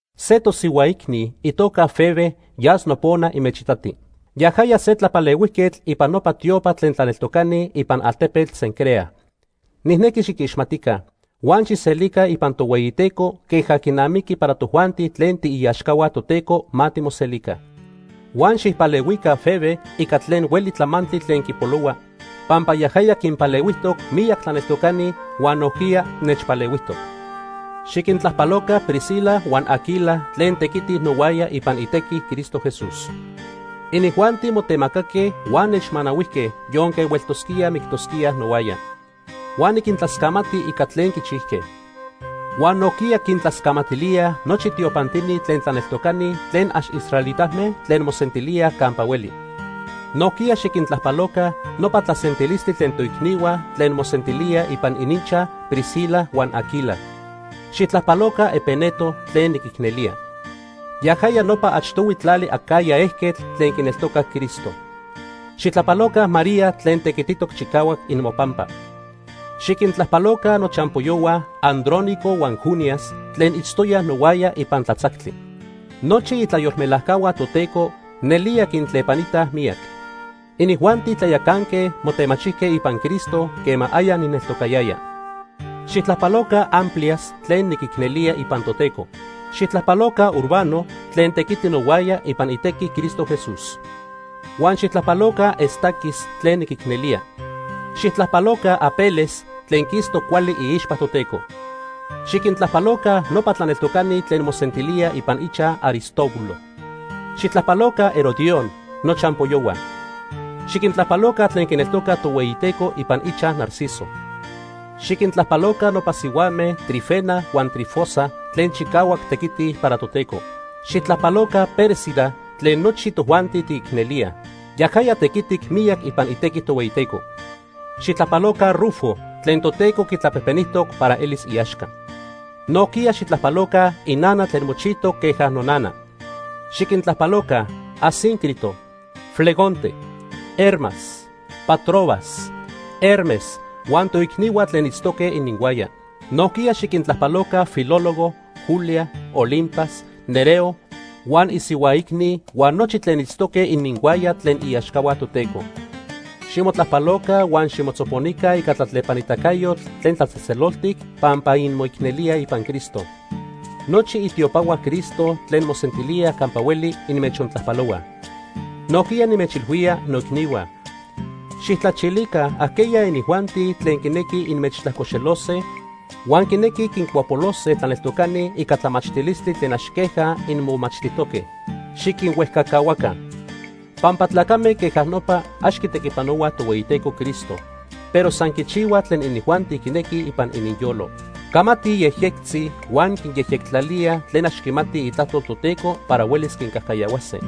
Se tosihua icni, itoca Febe, yas nopona inmechitati. Yajaya se tlapalehuijquetl ipan nopa tiopa tlen tlaneltocani ipan altepetl Cencrea. Nijnequi xiquixmatica, huan xijselica ipan Tohueyiteco queja quinamiqui para tojuanti tlen tiiaxcahua Toteco ma timoselica. Huan xijpalehuica Febe ica tlen hueli tlamantli tlen quipolohua, pampa yajaya quinpalehuijtoc miyac tlaneltocani huan nojquiya nechpalehuijtoc. Xiquintlajpaloca Priscila huan Aquila tlen tequitij nohuaya ipan itequi Cristo Jesús. Inijuanti motemacaque huan nechmanahuijque, yonque hueltosquíaj mictosquíaj nohuaya. Huan niquintlascamati ica tlen quichijque. Huan nojquiya quintlascamatilíaj nochi tiopantini tlen tlaneltocani tlen ax israelitame tlen mosentilíaj campa hueli. Nojquiya xiquintlajpaloca nopa tlasentilistli tlen toicnihua tlen mosentilíaj ipan ininchaj Priscila huan Aquila. Xijtlajpaloca Epeneto tlen niquicnelía. Yajaya nopa achtohui tlali Acaya ejquetl tlen quineltocac Cristo. Xijtlajpaloca María tlen tequititoc chicahuac imopampa. Xiquintlajpaloca nochampoyohua Andrónico huan Junias tlen itztoyaj nohuaya ipan tlatzactli. Nochi itlayolmelajcahua Toteco nelía quintlepanitaj miyac. Inijuanti tlayacanque motemachijque ipan Cristo quema aya nijneltocayaya. Xijtlajpaloca Amplias tlen niquicnelía ipan Toteco. Xijtlajpaloca Urbano tlen tequiti nohuaya ipan itequi Cristo Jesús. Huan xijtlajpaloca Estaquis tlen niquicnelía. Xijtlajpaloca Apeles tlen quistoc cuali iixpa Toteco. Xiquintlajpaloca nopa tlaneltocani tlen mosentilíaj ipan ichaj Aristóbulo. Xijtlajpaloca Herodión, nochampoyohua. Xiquintlajpaloca tlen quineltocaj Tohueyiteco ipan ichaj Narciso. Xiquintlajpaloca nopa sihuame Trifena huan Trifosa tlen chicahuac tequitij para Toteco. Xijtlajpaloca Pérsida tlen nochi tojuanti tiquicnelíaj. Yajaya tequitic miyac ipan itequi Tohueyiteco. Xijtlajpaloca Rufo tlen Toteco quitlapejpenijtoc para elis iaxca. Nojquiya xijtlajpaloca inana tlen mochijtoc queja nonana. Xiquintlajpaloca Asíncrito, Flegonte, Hermas, Patrobas, Hermes huan toicnihua tlen itztoque ininhuaya. Nojquiya xiquintlajpaloca Filólogo, Julia, Olimpas, Nereo huan isihua icni huan nochi tlen itztoque ininhuaya tlen iaxcahua Toteco. Ximotlajpaloca huan ximotzoponica ica tlatlepanitacayotl tlen tlatzejtzeloltic pampa inmoicnelíaj ipan Cristo. Nochi itiopahua Cristo tlen mosentilíaj campa hueli inmechontlajpalohuaj. Nojquiya, nimechilhuía, noicnihua, xijtlachilica ajqueya inijuanti tlen quinequij inmechtlajcoxelose huan quinequij quincuapolose tlaneltocani ica tlamachtilistli tlen ax queja inmomachtijtoque. Xiquinhuejcacahuaca. Pampa tlacame queja nopa ax quitequipanohuaj Tohueyiteco Cristo, pero san quichihuaj tlen inijuanti quinequij ipan ininyolo. Camatij yejyectzi huan quinyejyectlalíaj tlen ax quimatij itlajtol Toteco para huelis quincajcayahuase.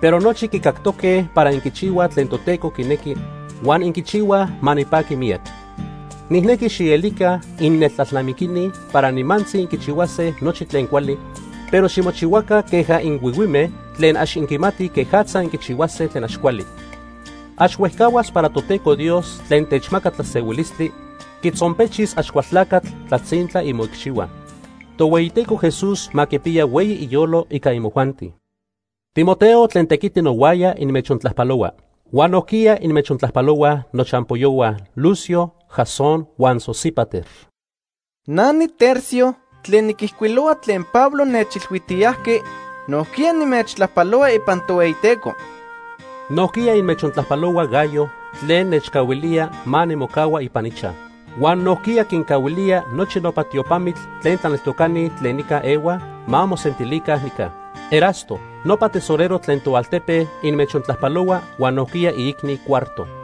Pero nochi quicactoque para inquichihuaj tlen Toteco quinequi, huan inquichihuaj ma nipaqui miyac. Nijnequi xielica inneltlalnamiquini para nimantzi inquichihuase nochi tlen cuali, pero ximochihuaca queja inhuihuime tlen ax inquimatij quejatza inquichihuase tlen ax cuali. Ax huejcahuas para Toteco Dios tlen techmaca tlasehuilistli quitzonpechis Axcualtlacatl tlatzintla imoicxihua. Tohueyiteco Jesús ma quipiya hueyi iyolo ica imojuanti. Timoteo tlen tequiti nohuaya inmechontlajpalohua. Huan nojquiya inmechontlajpalohuaj nochampoyohua Lucio, Jasón huan Sosípater. Na niTercio tlen niquijcuilohua tlen Pablo nechilhuijtiyajqui, nojquiya nimechtlajpalohua ipan Tohueyiteco. Nojquiya inmechontlajpalohua Gayo tlen nechcahuilía ma nimocahua ipan ichaj. Huan nojquiya quincahuilía nochi nopa tiopamitl tlen tlaneltocani tlen nica ehuaj ma mosentilica nica. Erasto nopa tesorero tlen toaltepe inmechontlajpalohua huan nojquiya iicni Cuarto.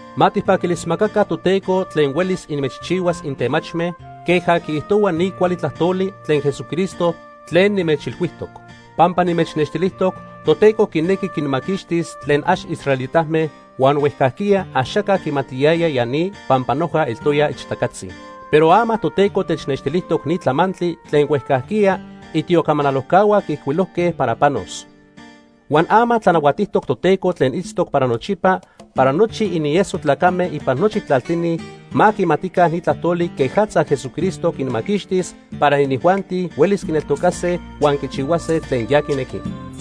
Ma tijpaquilismacaca Toteco tlen huelis inmechchihuas intemachme queja quiijtohua ni cuali tlajtoli tlen Jesucristo tlen nimechilhuijtoc. Pampa nimechnextilijtoc Toteco quinequi quinmaquixtis tlen ax israelitame huan huejcajquiya axaca quimatiyaya ya ni pampa noja eltoya ixtacatzi. Pero ama Toteco technextilijtoc ni tlamantli tlen huejcajquiya itiocamanalojcahua quiijcuilojque para panos. Huan ama tlanahuatijtoc Toteco tlen itztoc para nochipa para nochi inieso tlacame ipan nochi tlaltini ma quimatica ni tlajtoli quejatza Jesucristo quinmaquixtis para inijuanti huelis quineltocase huan quichihuase tlen ya quinequi.